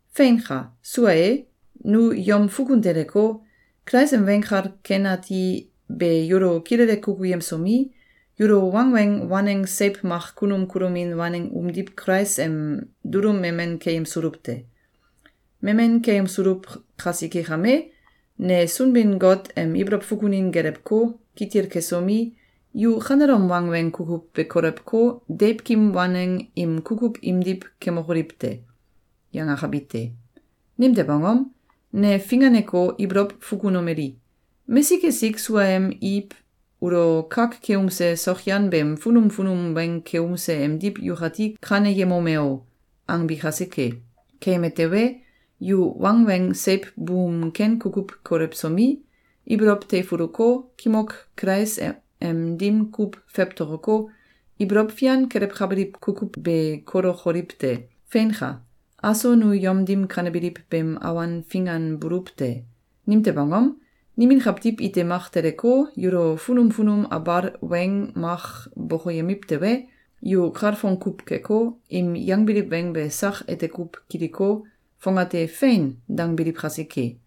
Feinka! Sua e, nu yom fukun teleko, Kulais em Weng Kal Ken Ati be yulo kilele kukuyemsomi, yulo wangweng waneng seiw mak kunum kulomin waneng umdiw Kulais em dulum memen keyemsuluw te. Memen keyemsuluw kasike kame, ne Sunbin-Got em ibolow fukunin gelewko, kitil kesomi, “Yu kanelom wangweng kukuw be kolewko, deiwkim waneng im kukuw imdiw kemokoliw te!”, yangakabi te. Nimtew angom? Ne finganeko, ibolow fukunomeli: “Mesik esik suaem Iw ulo kak keumse sokyan beem funum funum weng keumse emdiw yukati kaneyemome o!”, angbi kasike. Keyeme tewe, yu wangweng seiw buum ken kukuw kolewsomi, ibolow teifuluko, kimok Kulais em dim kuw fewtokoko, ibolow fian kelewkabiliw kukuw be kolokoliw te. Feinka! Aso nu yom dim kanebiliw beem awan finganbuluw te. Nimtew angom? Nimin kawtiw ite mak teleko, yulo funum funum abal weng mak bokoyemiw tewe, yu kalfong kuw keko, im yangbiliw weng be sak ete kuw kiliko, fongate “Fein!”, dangbiliw kasike.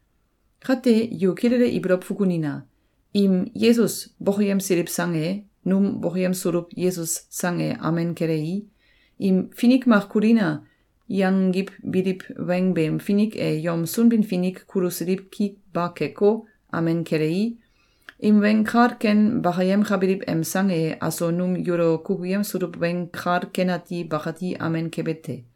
Kate, yu kilele ibolow fukunina! Im “Yesus” bokoyemsiliw sang e, num bokoyemsuluw “Yesus” sang e amen kelei, im “Finik mak kulina!”, yangiwbiliw weng beem finik e yom Sunbin-Finik kulusiliw ki ba keko, amen kelei, im weng kal ken bakayemkabiliw em sang e aso num yulo kukuyemsuluw Weng Kal Ken Ati bakati amen kebe te.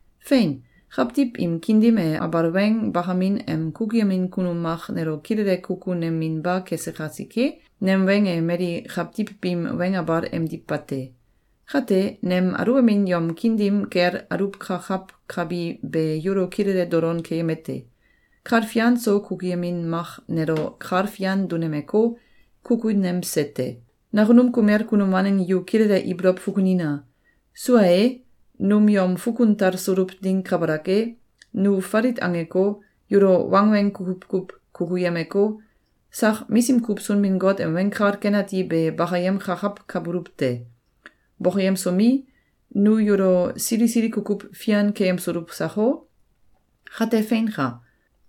Fein! Kawtiw im kiin dim e abal weng bakamin em kukuyemin kunum mak nelo kilele kukuneminba kese kasike, nem weng e mali kawtiw biim weng abal emdiw bate. Kate, nem aluwbamin yom kiin dim kel aluwkakawkabi be yulo kilele dolon keyemete: Kal fian so kukuyemin mak nelo kal fian dunemeko, kukunemse te. Nakunum kumel kunum waneng yu kilele ibolow fukunina! Sua e, num yom fukun talsuluw ding kabalak e, nu falit angeko, yulo wangweng kukuw kuw kukuyemeko, sak misim kuw Sunbin-Got em Weng Kal Ken Ati be bakayemkakawkabuluw te. Bokoyemsomi, nu yulo sili sili kukuw fian keyemsuluw sako? Kate feinka!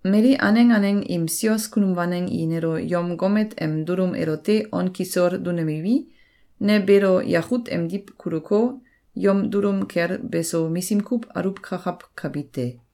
Mali aneng aneng im sios kunum waneng i nelo yom gomet em dulum elote on kisol dunemiwi, ne beelo yakut emdiw kuluko, yom dulum kel beso misim kuw aluwkakawkabi te.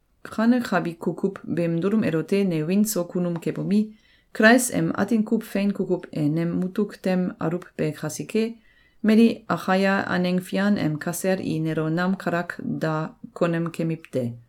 Kanekabi kukuw beem dulum elote ne wiin so kunum kebomi, Kulais em atin kuw fein kukuw e nem mutuk tem aluwbe kasike, mali Akaia aneng fian em kasel i nelo nam kalak da konem kemiw te.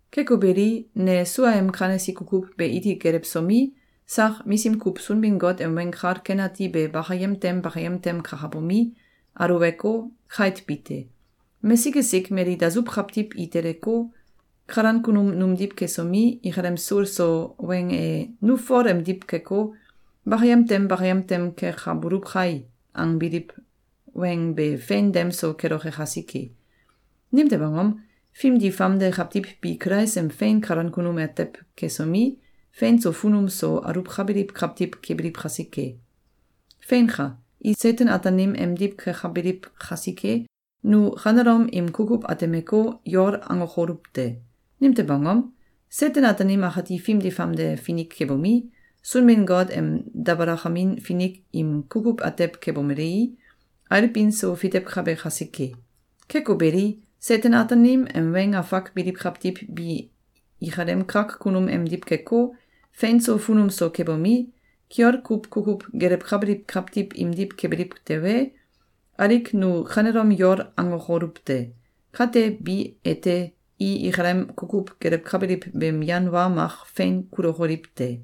Keko beli, ne suaem kanesi kukuw be iti gelewsomi, sak misim kuw Sunbin-Got em Weng Kal Ken Ati be bakayem tem bakayem tem kakabomi, aluweko, kait bi te. Mesik esik mali dasuw kawtiw i teleko, kalan kunum numdiw kesomi, ikalem sul so weng e “Nu Fol emdiw keko, bakayem tem bakayem tem kekabuluw kai!”, angbiliw weng be fein dem so keloke kasike. Nimtew angom? Fimdi famde kawtiw bi Kulais em fein kalan kunum atew kesomi, fein so funum so aluwkabiliw kawtiw kebiliw kasike. Feinka! I Seten-Ataanim emdiw kekabiliw kasike, nu kanelom im kukuw atemeko, yol angokoluw te! Nimtew angom? Seten-Ataanim akati fimdi famde finik kebomi, Sunbin-Got em dabalakamin finik im kukuw atew kebomelei, ailbin so fitewkabe kasike. Keko beli, Seten-Ataanim em weng afak biliw kawtiw bi ikalem kak kunum emdiw keko, fein so funum so kebomi, kiol kuw kukuw gelewkabiliw kawtiw imdiw kebiliw tewe, alik nu kanelom yol angokoluw te! Kate, bi ete, i ikalem kukuw gelewkabiliw beem yan wa mak fein kulokoliw te.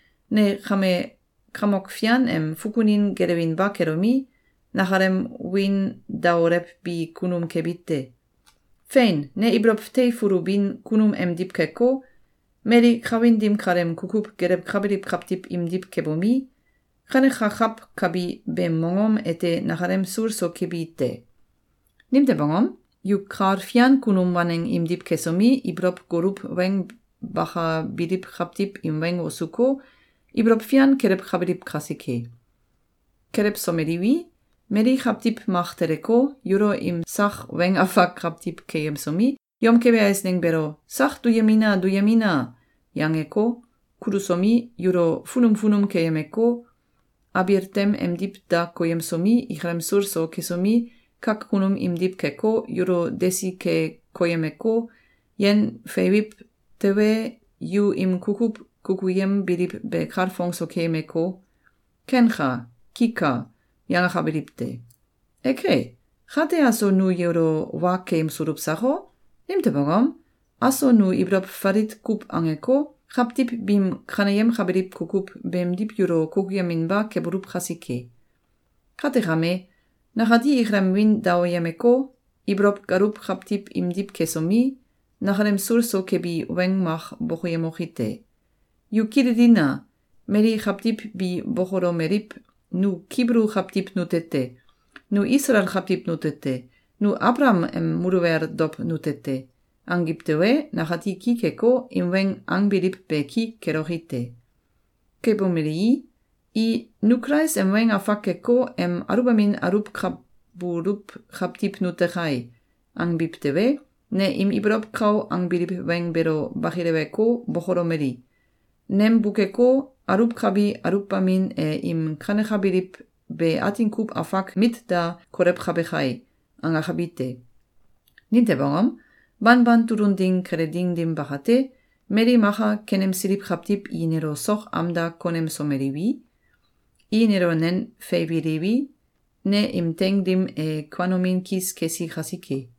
Ne kame Kamok Fian em fukunin gelewinba kelomi, nakalem wiin daolewbi kunum kebi te. Fein! Ne ibolow teifulubin kunum emdiw keko, mali kawin dim kaleem kukuw gelewkabiliw kawtiw imdiw kebomi, kanekakawkabi beem mongom ete nakalem sul so kebi te. Nimtew angom? Yu kal fian kunum waneng imdiw kesomi, ibolow goluw weng bakabiliw kawtiw im weng wosuko, ibolow fian kelewkabiliw kasike. Kelewsomeliwi, mali kawtiw mak teleko, yulo im sak weng afak kawtiw keyemsomi, yom kebe eisneng beelo “Sak duyemina! Duyemina!”, yangeko, kulusomi, yulo funum funum keyemeko, abil tem emdiw da koyemsomi, ikalem sul so kesomi, kak kunum imdiw keko, yulo desi ke koyemeko, yen feiwiw tewe, yu im kukuw kukuyembiliw be kalfong so keyemeko, “Kenka. Kika!”, yangakabiliw te. Eke, kate aso nu yulo wa keyemsuluw sako? Nimtew angom? Aso nu ibolow falit kuw angeko, kawtiw biim kaneyemkabiliw kukuw beemdiw yulo kukuyeminba kebuluw kasike. Kate kame, nakati ikalem wiin daoyemeko, ibolow galuw kawtiw imdiw kesomi, nakalem sul so kebi weng mak bokoyemoki te. Yu kililina! Mali kawtiw bi bokolomeliw: “Nu Kibulu kawtiw nute te! Nu Isalael kawtiw nute te! Nu Abalakam em muluwel dow nute te!”, angiw tewe, nakati ki keko, im weng angbiliw be ki keloki te. Kebomelii, i “Nu Kulais em weng afak keko, em aluwbamin aluwkabuluw kawtiw nute kai!”, angbiw tewe, ne im ibolow kau angbiliw weng beelo bakileweko, bokolomeli: “Nem bukeko, aluwkabi aluwbamin e im kanekabiliw be atin kuw afak mit da kolewkabe kai.”, angakabi te. Nimtew angom? Banban tulun ding kele ding dim bakate, mali maka kenemsiliw kawtiw i nelo sok am da konemsomeliwi, i nelo nen feiwiliwi, ne im teing dim e kuanomin kis kesi kasike.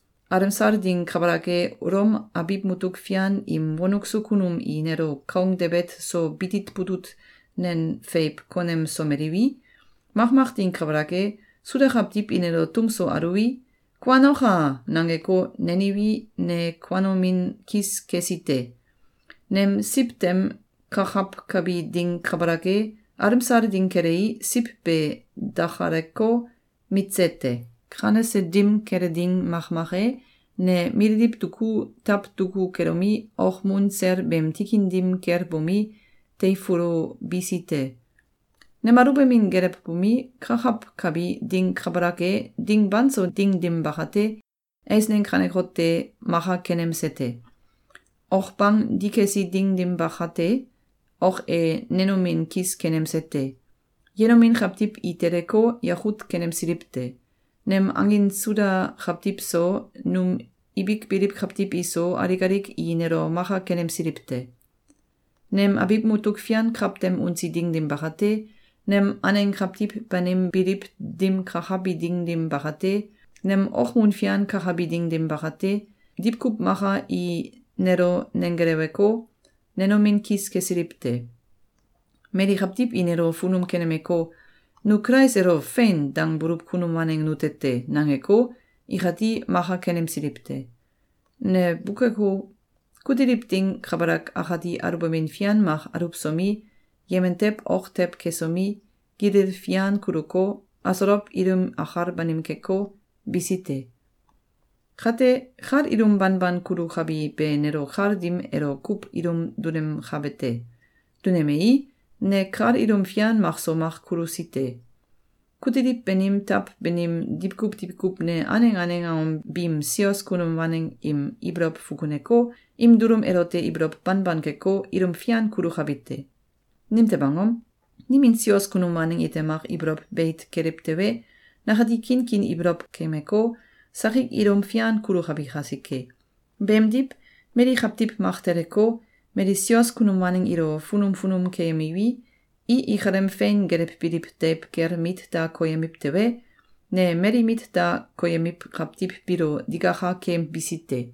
alemsal ding kabalak e, Ulom abiw mutuk fian im wonuk so kunum i nelo kaung debet so bitit butut nen feiw konemsomeliwi, makmak ding kabalak e, Suda kawtiw i nelo tum so aluwi, “Kuanoka!”, nangeko, neniwi, ne kuanomin kis kesi te. Nemésiw tem kakawkabi ding kabalak e, alemsal ding kelei, siw be dakaleko, mitse te. Kanese dim kele ding makmak e, ne mililiw duku, taw duku kelomi, okmun sel beem tikin dim kel bomi, teifulubisi te. Nem aluwbamin gelewbomi, kakawkabi ding kabalak e, ding banso ding dim bakate, eisneng kanekote maka kenemsete: Ok bang dikesi ding dim bakate, ok e nenomin kis kenemse te. Yenomin kawtiw i teleko, yakut kenemsiliw te. Nem angin Suda kawtiw so, num ibik biliw kawtiw iso, alik alik i nelo maka kenemsiliw te. Nem abiw mutuk fian kawtem unsi ding dim bakate, nem aneng kawtiw banim biliw dim kakabi ding dim bakate, nem okmun fian kakabi ding dim bakate, diwkuw maka i nelo nenggeleweko, nenomin kis kesiliw te. Mali kawtiw i nelo funum kenemeko, “Nu Kulais elo ‘Fein!’, dangbuluw kunum waneng nute te!”, nangeko, ikati maka kenemsiliw te. Ne bukeko, kutiliw ding kabalak akati aluwbamin fian mak aluwsomi, yemen tew ok tew kesomi, gilil fian kuluko, asolow ilim akal banim keko, bisi te. Kate, kal ilum banban kulukabi be nelo kal dim elo kuw ilum dunemkabe te. Dunemei, ne kal ilum fian makso mak kulusite: Kutiliw banim taw banim diwkuw diwkuw ne aneng aneng angom biim sios kunum waneng im ibolow fukuneko, im dulum elote ibolow banban keko, ilum fian kulukabi te. Nimtew angom? Nimin sios kunum waneng ite mak ibolow beit keliw tewe, nakati kinkin ibolow keyemeko, sakik ilum fian kulukabi kasike. Beemdiw, mali kawtiw mak teleko, mali sios kunum waneng ilo funum funum keyemiwi, i ikalem fein gelewbiliw deiw kel mit da koyemiw tewe, ne mali mit da koyemiw kawtiw biilo digaka keyembisi te.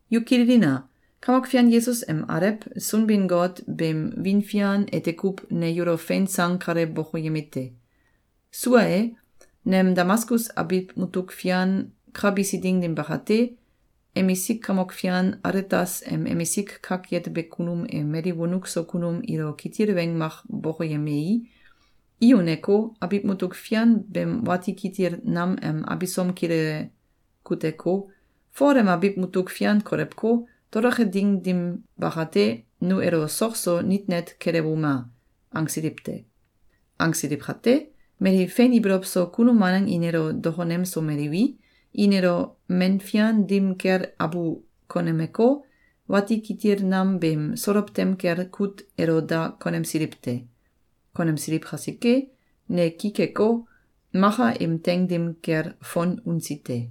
Yu kililina! Kamok Fian Yesus em Alew Sunbin-Got beem wiin fian ete kuw ne yulo fein sang kale bokoyemite: Sua e, nem Damaskus abiw mutuk fian ka bisi ding dim bakate, emisik kamok fian Aletas em emisik kak yetebe kunum e mali wonuk so kunum ilo kitil weng mak bokoyemei, i uneko, abiw mutuk fian beem wati kitil nam em abisom kilele kuteko, “Fol em abiw mutuk fian kolewko, toloke ding dim bakate, nu elo sok so nit net kelewuma!”, angsiliw te. Angsiliw kate, mali fein ibolow so kunum waneng i nelo dokonemsomeliwi, i nelo men fian dim kel abu konemeko, wati kitil nam beem solow tem kel kut elo da konemisiliw te. Konemsiliw kasike, ne ki keko, maka im teing dim kel fon unsi te.